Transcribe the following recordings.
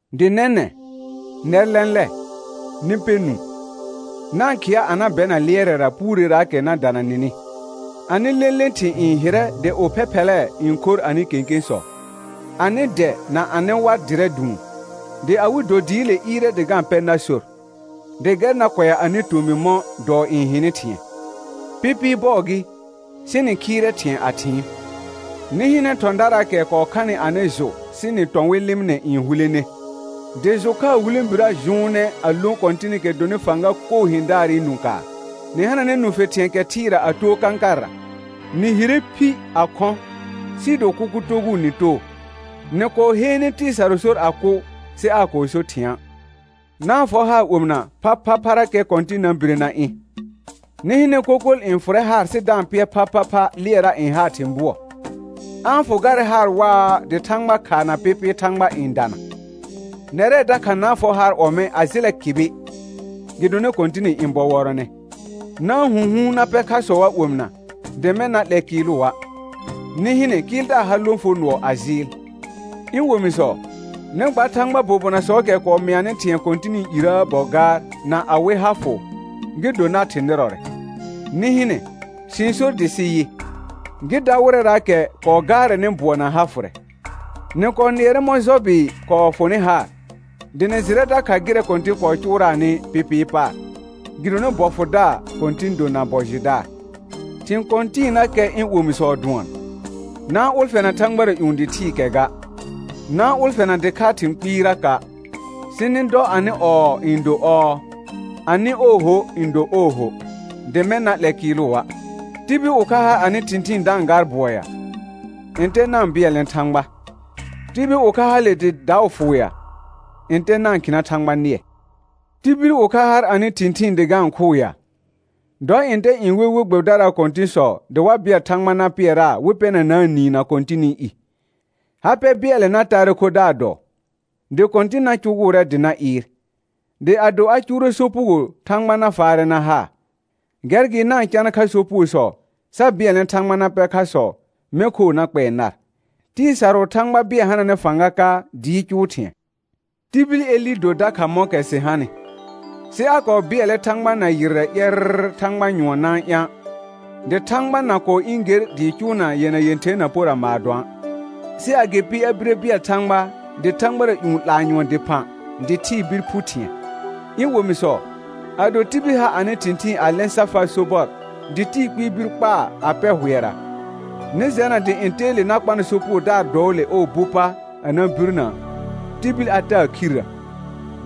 Dɩ nɛnɛ̃, nɛr lɛ̃lɛ, nɩ pɛ nũu, na-n khɩa a na bɛna lɩɛrɛra puureraakɛ na dana nɩnɩ. Anɩ lẽle thɩ̃ n hɩrɛ dɩ ophɛphɛlɛɛ n khor anɩ kẽkẽsɔ. Anɩ dɛ na anɩ war dɩrɛ dʋʋn, dɩ awɩ do dɩɩle ɩɩrɛ dɩ ga-n pɛ nar sor, dɩ gɛr na kʋɛa anɩ tomɩ mɔ̃ dɔɔ n hɩnɩ thɩ̃ɛ. Pɩpɩɩ bɔɔ gɩ, sɩ nɩ khɩɩrɛ thɩ̃ɛ a thɩɩn. Nɩ hɩnɛ thɔ̃daraakɛ kɔɔ khanɩ anɩ jʋ sɩ nɩ tɔ̃ wɩ lɩmɩnɛ n hulene, dɩ jʋ khaa hulẽbirə jʋʋnɛ a lõ Kɔ̃tɩnɩkɛ dɔnɩ fãga koo hɩ̃daarɩ nũ kaar. Nɩ hananɛ nũfe thɩ̃ɛ kɛ thɩɩra a too kãkarra; nɩ hire phi a khɔ̃, sɩɩ do kʋkʋ togʋʋ nɩ too. Nɩ kɔɔ heene tɩɩ sarʋ sor a kʋ, sɩ aa kɔɔ so thɩ̃a'. Na-n fɔ haar omɩna phaphapharakɛ Kɔ̃tɩn na bire na ɩ̃. Nɩ hɩnɛ kokol n fʋrɛ haar sɩ da-n pɩɛr phaphapha lɩɛra n haa thĩ bʋɔ. A-n fʋ garɛ haar waa dɩ thãgba khaa na pɩpɩɩ thãgba n dana. Nɛrɛ dakha na-n fɔ haar ɔmɛ̃ a jɩlɛ kɩbɩ, gɩdonɩ Kɔ̃tɩnɩ ɩ̃ bɔ wɔrɔnɛ. Na-n hũhuun na pɛ khasɔa' omɩna, dɩ mɛ̃ na 'lɛ kɩɩlʋa'. Nɩ hɩnɛ kɩɩldaar har lõfonɔɔ a jɩɩl. Ɩ̃ omisɔ, nɩ gba Thãgbaa bobonasɔɔkɛ kɔɔ mɩanɩ thɩ̃ɛ Kɔ̃tɩnɩ irəə bɔ gaar na awɩ ha fʋ, gɩ do nar thɩ̃ nɩrɔrɛ. Nɩ hɩnɛ, sɩ-n sor dɩ sɩ yɩ: Gɩ da wɩrɛraakɛ kɔɔ gaarɛnɩ bʋɔ na ha fʋrɛ. Nɩ kɔɔ nɩɛrɛ mɔ̃ Jɔbɩ kɔɔ fʋnɩ haar, dɩ nɩ jɩrɛ dakha gɩrɛ Kɔ̃tɩn kɔɔ cʋʋraanɩ pɩpɩɩ paar, gɩdonɩ bɔ fʋdaar Kɔ̃tɩn do na bɔ jɩdaar. Thɩ̃ kɔ̃tɩɩnakɛ ɩ̃ omisɔ dʋɔn, na-n ʋlfɛna thãgbara ƴũ dɩ thɩɩkɛ ga; na-n ʋlfɛna dɩkhaa thɩ̃ kpɩɩraka', sɩ nɩ dɔ anɩ «ɔɔ» n do «ɔɔ», anɩ «ooho» n do «ooho», dɩ mɛ̃ na 'lɛ kɩɩlʋa'. Tibil ʋkha har anɩ thɩ̃thɩɩn da-n gaar bʋɔ ya? Ntɛ na-n bɩɛlnɛ Thãgba. Tibil ʋkha hale dɩ daʋ fʋʋ ya? Ntɛ na-n khɩna Thãgba nɩɛ. Tibil ʋkha har anɩ thɩ̃thɩɩn dɩ ga-n khʋʋ ya? Dɔ ntɛ n we we gbɛbɩdaraa kɔ̃tɩ̃sɔ dɩ wa bɩɛl Thãgba na pɩɛraa wɩ pɛnanaa niin na Kɔ̃tɩnɩ i. Ha pɛ bɩɛlɛ na taarɛ khodaar dɔɔ, dɩ Kɔ̃tɩn na cʋgʋʋrɛ dɩ na ɩɩr, dɩ ado a cʋʋrɛ sopugo Thãgba na faarɛ na haa. Gɛr gɩ na-n cana kha sopugosɔ, sa bɩɛlnɛ Thãgba na pɛ khasɔ, mɛ̃ khoo na kpɛɛ nar. Tɩɩ sarʋʋ Thãgba bɩɛl hananɛ fãga ka dɩɩ cʋʋ thɩ̃ɛ. Tibil Elɩ do dakha mɔ̃kɛ sɩ hanɩ, sɩ a kɔɔ bɩɛlɛ Thãgba na yɩrrɛ ƴɛrr thãgba nyʋɔn na-n ɩ̃a', dɩ thãgba na kɔɔ ɩ̃ ger dɩɩ cʋʋna yɛna yẽther na pora maadõa'. Sɩ agɩpɩ a bire bɩɛl Thãgba dɩ thãgbara ƴũ 'laa nyʋɔn dɩphã dɩ thɩɩ bir phu thɩ̃ɛ. Ɩ̃ omisɔ, ado tibil ha anɩ thɩ̃thɩɩn a lɛ̃ sa faa sobɔr dɩ tɩɩ kpɩɩ bir kpaa a pɛ hʋɛra, nɩ jɛna dɩ ntɛɛle na kpanɩ sopugodaar dɔɔle ɔɔ bu pa a na birnə, tibil a taa khirrə,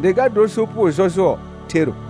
dɩ ga dor sopugo jɔjʋɔ thero.